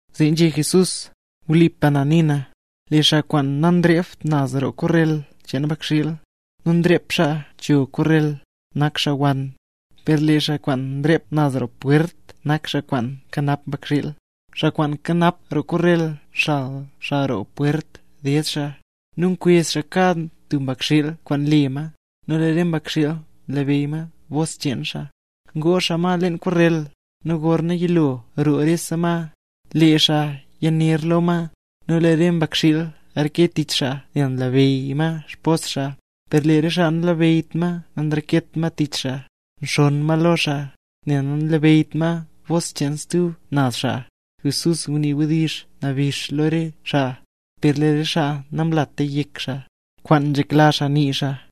Zee nzhé Jesús: —Wlipa na nii na, lee xaa kwaan nanrept naz roo korrel cheen mbakxiil, nu nrep xaa naz cho korrel, nak xaa wann. Per lee xaa kwaan nrep naz roo pwert nak xaa kwaan nkanap mbakxiil. Xaa kwaan nkanap roo korrel nxal xaa roo pwert ded xaa, nu nkwezh xaa kad tub mbakxiil kwaan le ma, nu lee re mbakxiil nlabeyy bos cheen xaa. Ngoo xaa ma leen korrel, nu gorna yilo roo rese ma, lee xaa nyaner lo ma, nu lee re mbakxiil nreke tich xaa nel nlabeyy ma xbos xaa. Per lee xaa nanlabeyyt ma nanreket ma tich xaa, nxonn ma lo xaa, nel nanlabeyyt ma bos cheen stub naz xaa. Jesús ngunii wdizh nabix ne lo re xaa, per lee re xaa namlata yek xaa, kwaan nzhekla xaa nii xaa.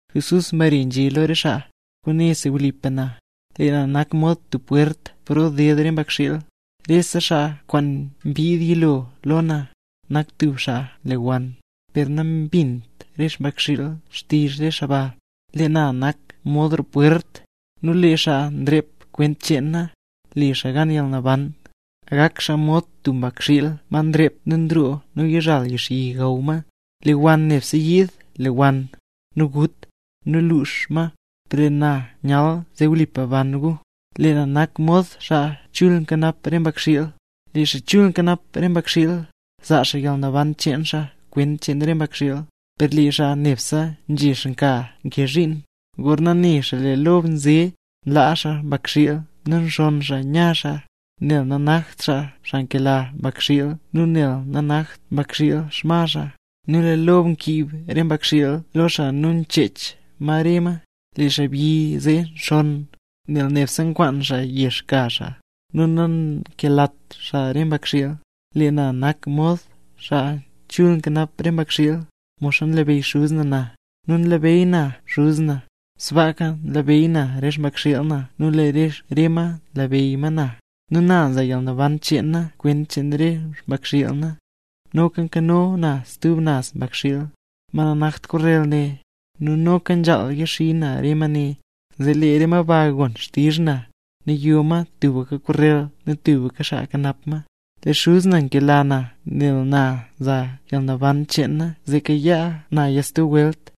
Jesús mbare nzhé lo re xaa: —Kwaane si wlipa na: Lee na nak mod tub pwert paro nded re mbakxiil. Rese xaa kwaan mbid yilo lo na, nak tub xaa nlewann; per nambint re mbakxiil xtizh re xaa ba. Lee na nak mod roo pwert, nu lee xaa nrep kwent cheen na, le xaa gan yalnaban. Gak xaa mod tub mbakxiil ma nrep nu nroo nu nyazhal yixyi gaw ma. ’Lee wann nebse nyiid lewann, nu gut, nu lux xaa ma; per lee na nyal zee wlipa ban gu. Lee na nak mod xaa chul nkanap re mbakxiil. Lee xaa chul nkanap re xmbakxiil, nzaa xaa yalnaban cheen xaa kwent cheen re mbakxiil. Per lee xaa nebse nzhex nka nkee zhiin, gorna ne xaa lee lob nze, zee nlaa xaa mbakxiil nu nxonn xaa nya xaa, nel nanakt xaa xaa nkela mbakxiil nu nel nanakt mbakxiil xma xaa. Nu lee lob nkiib re mbakxiil lo xaa nu nchech ma re ma. Lee xaabyi zee nxonn, nel nebse nkwaan xaa yex ka xaa, nu nankelat xaa re mbakxiil. ’Lee na nak mod xaa chul nkanap re mbakxiil. Modxa nlabeyy Xuz na na, nu nlabeyy na Xuz na, sbaaka nlabeyy na re xmbakxiil na nu lee re ma nlabeyy ma na. Nu na za yalnaban cheen na kwent cheen re xmbakxiil na. Noka nkano na stub naz mbakxiil, ma nanakt korrel ne; nu noka nzhaal yaxii na re ma ne. Zee lee re ma ba gon xtizh na, nu yo ma tubka korrel nu tubka xaa kanap ma. ’Lee Xuz na nkela na nel na nza yalnaban cheen na zee kayaa naya stub welt.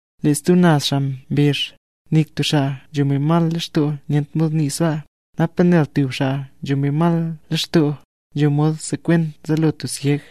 Lee stub naz xaa mbezh: —Nik tub xaa nzho mbi mal lextoo nyent mod nii sbaa. ¿Napa nel tub xaa nzho mbi mal lextoo, nzho mod sekwen zaalo tub syeg?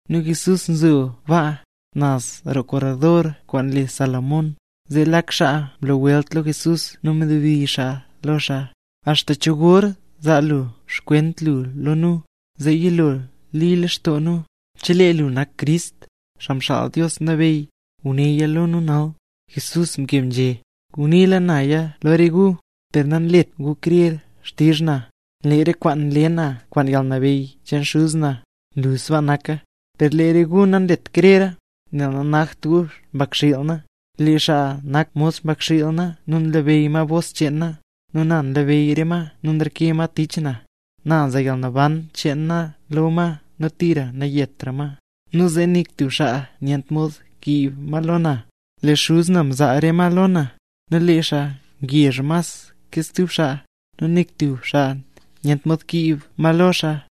Nu Jesús nzo baa, naz roo korredor kwaan le Salomón. Zee lee lak xaa mlo welt lo Jesús nu mnabdizh xaa lo xaa: —¿Axta cho gor zaa lu xkwent lu lo nu, zee yilo li lextoo nu? Chelee lu nak Crist, Xaa Xaal Dios Nabeyy, gunéya lo nu nal. Jesús mkeb nzhé: —Nguniila naya lo re gu, per nanlet gu krer xtizh na. Lee re kwaan nle na kwaan yalnabeyy cheen Xuz na, nlu sbaa naka. Per lee re gu nanlet krera, nel nanakt gu xmbakxiil na. Lee xaa nak mod xmbakxiil na nu nlabeyy ma bos cheen na, nu na nlabeyy re ma nu nreke ma tich na. Na nza yalnaban cheen na lo ma nu tira nayetra ma, nu zee nik tub xaa nyent mod kiib ma lo na. Lee Xuz na mzaa re ma lo na, nu lee xaa ngezh mas ke stub xaa, nu nik tub xaa nyent mod kiib ma lo xaa.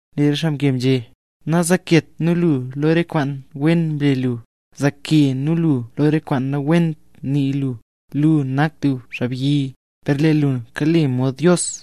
Lee re xaa mkeb nzhé: —Nazaaket nu lu lo re kwaan wen mle lu, zaake nu lu lo re kwaan nawent nii lu. Lu nak tub xaabyi, per lee lu kale mod Dios.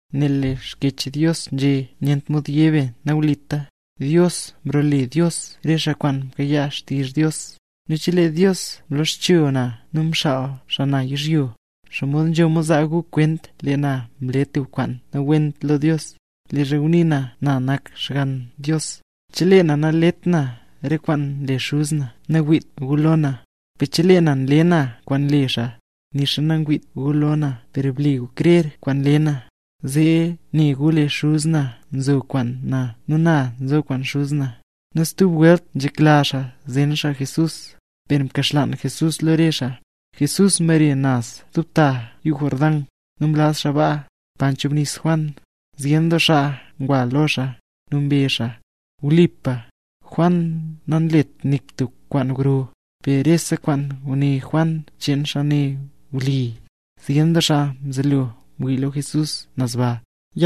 Nel lee Xkyech Dios nzhé nyent mod yé be nawlita, Dios mrole dios re xaa kwaan mkayaa xtizh Dios. Nu chelee Dios mloxcho na nu mxaal xaa na yizhyo, ¿xomod nzho mod zaa gu kwent lee na mle tub kwaan nawent lo Dios, leezha ngunii na nak na Xgann Dios? Chelee na nalet na re kwaan nle Xuz na nawiit gu lo na. Per chelee na nle na kwaan nle xaa, nixa nangwiit gu lo na per ble gu krer kwaan nle na, zee ne gu lee Xuz na nzo kwaan na nu na nzo kwaan Xuz na. Nu stub welt nzhekla xaa zen xaa Jesús, per mkaxlaan Jesús lo re xaa. Jesús mbare naz stub ta yuu Jordán, nu mlaz xaa baa, pa mchubnis Juan. Zyen doo xaa ngwa lo xaa, nu mbezh xaa: —Wlipa, Juan namlet nik tub kwaan gro, per rese kwaan nguné Juan cheen xaa ne wli. Zyen doo xaa mzelo ngwii lo Jesús naz baa.